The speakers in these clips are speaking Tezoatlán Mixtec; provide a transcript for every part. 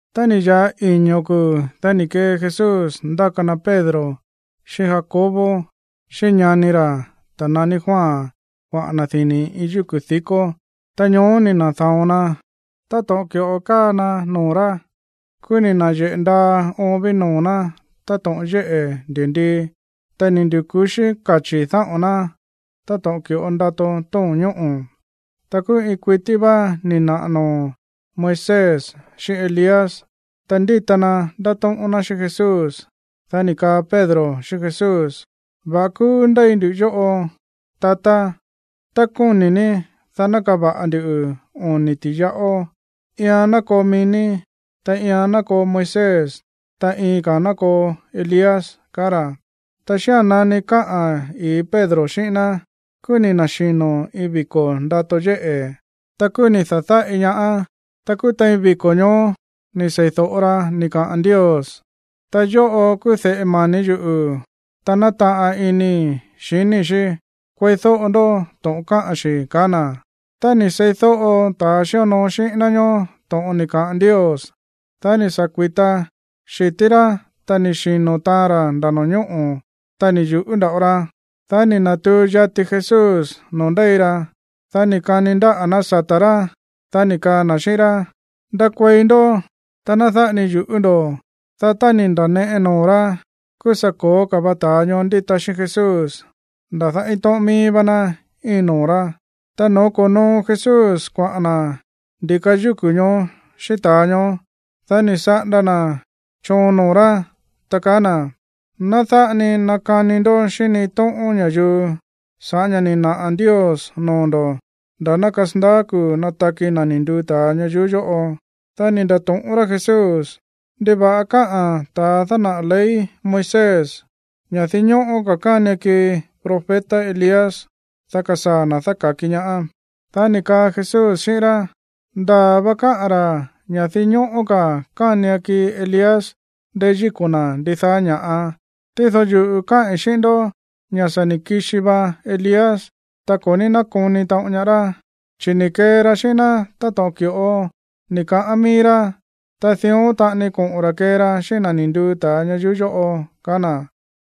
Tá ni̱ ya̱ꞌa iño̱ kuu̱, dá ni̱ kee Jesús ndáka na Pedro, xíꞌín Jacobo, xíꞌín ñani ra̱, ta̱ naní Juan kuaꞌa̱n na̱ dini̱ iin yúku̱ di̱kó. Ta ñoó ni̱ na̱da̱on na táto̱ꞌon ki̱ꞌo káa na noo̱ rá. Kúú ni̱ na̱yeꞌe̱ ndaa oon ví noo̱ ná táto̱ꞌon yéꞌe̱ ndi̱ndii. Ta ni̱ ndu̱ku̱xí kachi̱ dáꞌo̱n ná táto̱ꞌon ki̱ꞌo ndato tóo̱n ñóꞌo̱. Ta kúú iin kuití vá ni̱ naꞌa̱ noo̱ Moisés xíꞌín Elías, ta ndíta na ndátóꞌón ná xíꞌín Jesús. Dá ni̱ kaa Pedro xíꞌín Jesús: ―Va̱ꞌa kúú ndéi ndu yóꞌo, tatá. Tá kóni̱ ní, dá ná kava̱ꞌa ndu oni̱ ti̱yaꞌó. Iian ná koo mií ní, ta iian ná koo Moisés, ta iin ka̱a̱n ná koo Elías ―kaá ra̱. Ta xía̱n nani káꞌa̱n ii̱ Pedro xíꞌín ná, kúú ni̱ na̱xino̱ iin viko̱ ndato yéꞌe̱. Ta kúú ni̱ da̱dáꞌi ñaá. Ta kúú tein viko̱ ñoó ni̱ sei̱do̱ꞌo ra ni̱ kaꞌa̱n Ndios: ―Ta̱ yóꞌo kúú de̱ꞌe mani̱ yuꞌu̱, ta nátaꞌan inii̱ xiníi̱ xí. Kueídóꞌo ndó to̱ꞌon káꞌa̱n xi̱ ―kaá na̱. Tá ni̱ seídóꞌo ta̱ xíonoo xíꞌín ná ñoó to̱ꞌon ni̱ kaꞌa̱n Ndios, dá ni̱ sa̱ kui̱ta xi̱tí rá, ta ni̱ xino̱ taan ra̱ nda̱ no̱ñóꞌo̱, ta ni̱ yu̱ꞌú nda̱ꞌo ra. Dá ni̱ na̱tuu yati Jesús noo̱ ndéi ra, dá ni̱ kani ndáꞌa̱ ná sata̱ rá, dá ni̱ kaa na̱ xíꞌín rá: ―Ndakuei ndó, ta ná dáꞌa ni yu̱ꞌú ndo̱. Dá tá ni̱ nda̱neꞌe noo̱ rá, kúú sa̱ ko̱ó ka̱ va ta̱a ñoó ndíta xíꞌín Jesús. Nda̱dá iin tóꞌón míí vá ná íin noo̱ rá. Ta no̱ó ko̱noo Jesús kuaꞌa̱n na̱ ndi̱ka yúku̱ ñoó xíꞌín ta̱a ñoó, dá ni̱ saꞌanda na̱ choon noo̱ rá, ta kaá na̱: ―Ná dáꞌa ni nakani ndó xíꞌín ni iin tóꞌón ña̱yuu sa̱ꞌá ña̱ ni̱ naꞌa̱ Ndios noo̱ ndo̱ nda̱ ná kasandaá kuu̱ nataki na̱ ni̱ nduu ta̱a ñayuú yóꞌo. Dá ni̱ nda̱to̱ꞌón rá Jesús: ―¿Ndiva̱ꞌa káꞌa̱n ta̱a dánaꞌa̱ ley Moisés ña̱ dinñóꞌó ka̱ kánian kii profeta Elías, dá kasaa̱ na̱ dáka̱ki ñaá? Dá ni̱ kaa Jesús xíꞌín rá: ―Ndaa̱ va káꞌa̱n ra̱ ña̱ dinñóꞌó ka̱ kánian kii Elías ndeyíko̱ na̱ ndidaá ña̱ꞌa. Tído yuꞌu̱ káꞌi̱n xíꞌín ndó ña̱ sa̱ ni̱ kixi va Elías, ta ko̱ ní nákoni taꞌon ñaá rá, chi̱ ni̱ kee ra xíꞌín ná táto̱ꞌon ki̱ꞌo ni̱ kaꞌán mií rá. Ta dión taꞌani koꞌo̱n ra̱ kee ra xíꞌín na̱ ni̱ nduu ta̱a ñayuú yóꞌo ―ka̱á na̱.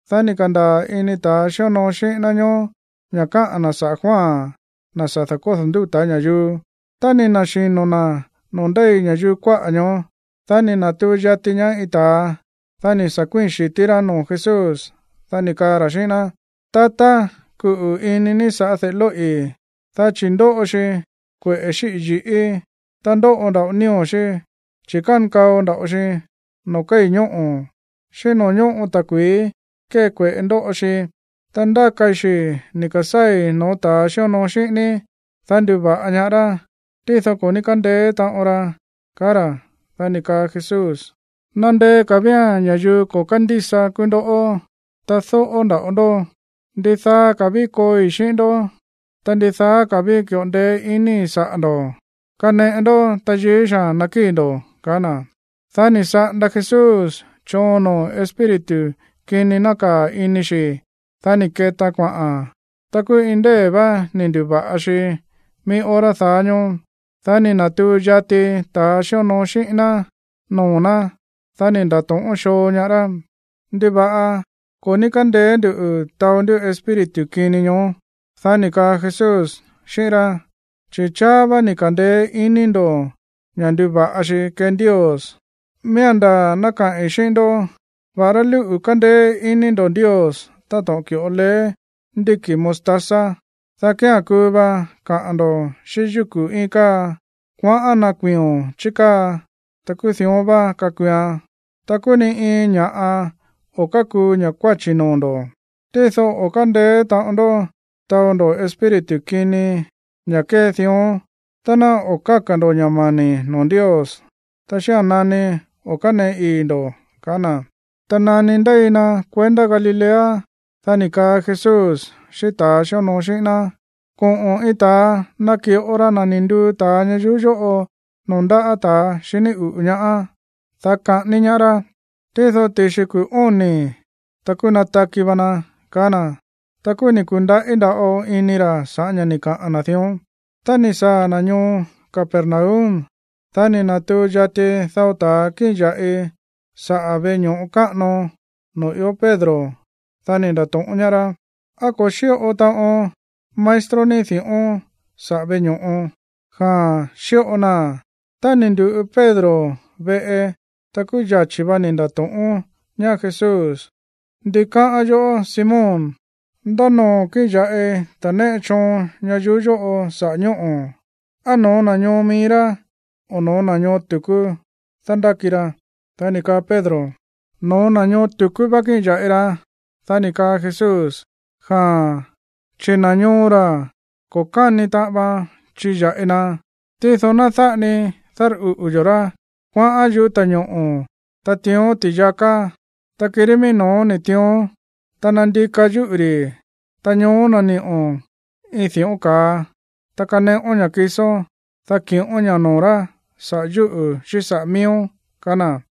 Dá ni̱ ka̱ndaa̱ ini ta̱ xíonoo xíꞌín ná ñóó ña̱ káꞌa̱n na̱ saꞌa̱ Juan, na̱ sa̱ da̱kódo̱ ndúta̱ ña̱yuu. Tá ni̱ na̱xino̱ na̱ noo̱ ndéi ña̱yuu kuáꞌa̱ ñoó, dá ni̱ na̱tuu yati ñaá iin ta̱a, dá ni̱ sa̱ kuíi̱n xi̱tí rá noo̱ Jesús, dá ni̱ kaa ra̱ xíꞌín ná: ―Tatá, kuꞌu̱ ini ní sa̱ꞌá de̱ꞌe lóꞌi̱, dá chi̱ ndóꞌo xi kueꞌe̱ xíꞌi̱ yi̱ꞌí, ta ndóꞌo nda̱ꞌo nío̱ xí, chi̱ kánkao nda̱ꞌo xi noo̱ kéi̱ ñóꞌo̱, xíꞌín noo̱ ñóꞌo ta̱kui̱í kée kueꞌe̱ ndóꞌo xi. Ta ndákai xi̱ ni̱ ka̱sáa̱i̱ no̱ó ta̱a xíonoo xíꞌín ní, dá nduva̱ꞌa ñaá rá, tído ko̱ ní kándeé taꞌon ra ―kaá ra̱. Dá ni̱ kaa Jesús: ―¡Nandeé ka̱ vía̱n ña̱yuu ko̱ kándísa kúú ndoꞌó, ta dóꞌó nda̱ꞌo ndó! ¿Ndidaa ka̱ ví kooi xíꞌín ndó? Ta, ¿ndidaa ka̱ ví ki̱ꞌo ndeé iníi̱ saꞌa̱ ndo̱? Kaneꞌe ndó tayií xaa̱n nakíi̱ ndo̱ ―kaá na̱. Dá ni̱ saꞌanda Jesús choon noo̱ espíritu kini nákaa̱ ini xi̱. Dá ni̱ ketaan kuaꞌa̱n. Ta kúú iin ndée̱ vá ni̱ ndu̱va̱ꞌa xi mií hora daá ñóó. Dá ni̱ na̱tuu yati ta̱ xíonoo xíꞌín ná noo̱ ná, dá ni̱ nda̱to̱ꞌón xoo ñaá rá: ―¿Ndiva̱ꞌa ko̱ ní kándeé nduꞌu̱ taó ndú espíritu kini ñoó? Dá ni̱ kaa Jesús xíꞌín rá: ―Chi̱ cháá vá ni̱ ka̱ndeé iní ndo̱ ña̱ nduva̱ꞌa xi kee Ndios. Miía̱n ndaa̱ ná kaꞌi̱n xíꞌín ndó ña̱ va̱ꞌará lúꞌu̱ kandeé iní ndo̱ Ndios táto̱ꞌon ki̱ꞌo leé ndíki̱ mostaza, dá kía̱n kuu va kaꞌa̱n ndo̱ xíꞌín yúku̱ íin káa: “Kuaꞌán ná kuiio̱n chí káa”; ta kúú dión vá kakuuan. Ta kúú ni iin ña̱ꞌa o̱ kákuu ña̱ kuáchi̱ noo̱ ndo̱. Tído o̱ kándeé taꞌon ndó taó ndo̱ espíritu kini, ña̱ kée dión, tá ná o̱ káka̱ ndo̱ ña̱ mani̱ noo̱ Ndios, ta xía̱n nani o̱ káneꞌe ii̱ ndo̱ ―kaá na̱. Ta nani ndéi na kuendá Galilea, dá ni̱ kaa Jesús xíꞌín ta̱ xíonoo xíꞌín ná: ―Koꞌo̱n iin ta̱a naki̱ꞌo ra na̱ ni̱ nduu ta̱a ñayuú yóꞌo noo̱ ndáꞌa̱ ta̱ xiní uꞌu̱ ñaá, dá kaꞌání ñaá rá. Tído ti̱xi kuu̱ óni̱, ta kúú nataki va na ―kaá na̱. Ta kúú ni̱ ku̱ndaꞌí nda̱ꞌo ini ra̱ sa̱ꞌá ña̱ ni̱ kaꞌa̱n na̱ dión. Tá ni̱ saa̱ na̱ ñoo Capernaum, dá ni̱ na̱tuu yati dao ta̱a kíꞌin ya̱ꞌi saꞌa̱ veꞌe ño̱ꞌo káꞌano noo̱ ió Pedro, dá ni̱ nda̱to̱ꞌón ñaá rá: ―¿Á ko̱ xíꞌo taꞌon maestro ní di̱ꞌón saꞌa̱ veꞌe ño̱ꞌo? Dá ni̱ kaa Pedro: ―Jaa̱n, xíꞌo naa̱n. Tá ni̱ ndu̱ꞌu Pedro veꞌe, ta kúú yachi̱ va ni̱ nda̱to̱ꞌón ñaá Jesús: ―¿Ndi káꞌán yoꞌó, Simón? ¿Ndá noo̱ kíꞌin ya̱ꞌi ta̱ néꞌe choon ñayuú yóꞌo saꞌa̱ ñóꞌo̱? ¿Á no̱ó na̱ ñoo mií rá, o no̱ó na̱ ñoo tu̱kú dándáki ra? Dá ni̱ kaa Pedro: ―No̱ó na̱ ñoo tu̱kú vá kíꞌin ya̱ꞌi ra. Dá ni̱ kaa Jesús: ―Jaa̱n, chi̱ na̱ ñoo ra̱, ko̱ káni taꞌan vaan chiya̱ꞌi na. Tído ná dáꞌa ni dárꞌuꞌu̱ yo̱ rá. Kuaꞌán yúꞌu̱ ta̱ñoꞌo̱, ta tiión ti̱yaká, ta kirí mií no̱ó ni̱ tiión, ta nandika̱ yúꞌu̱ ri̱. Ta ñoó nani̱ꞌo̱n iin di̱ꞌón ka̱a. Ta kaneꞌón ña̱ kisón, dá ki̱ꞌón ña̱ noo̱ rá saꞌa̱ yúꞌu̱ xíꞌín saꞌa̱ miíón ―kaá na̱.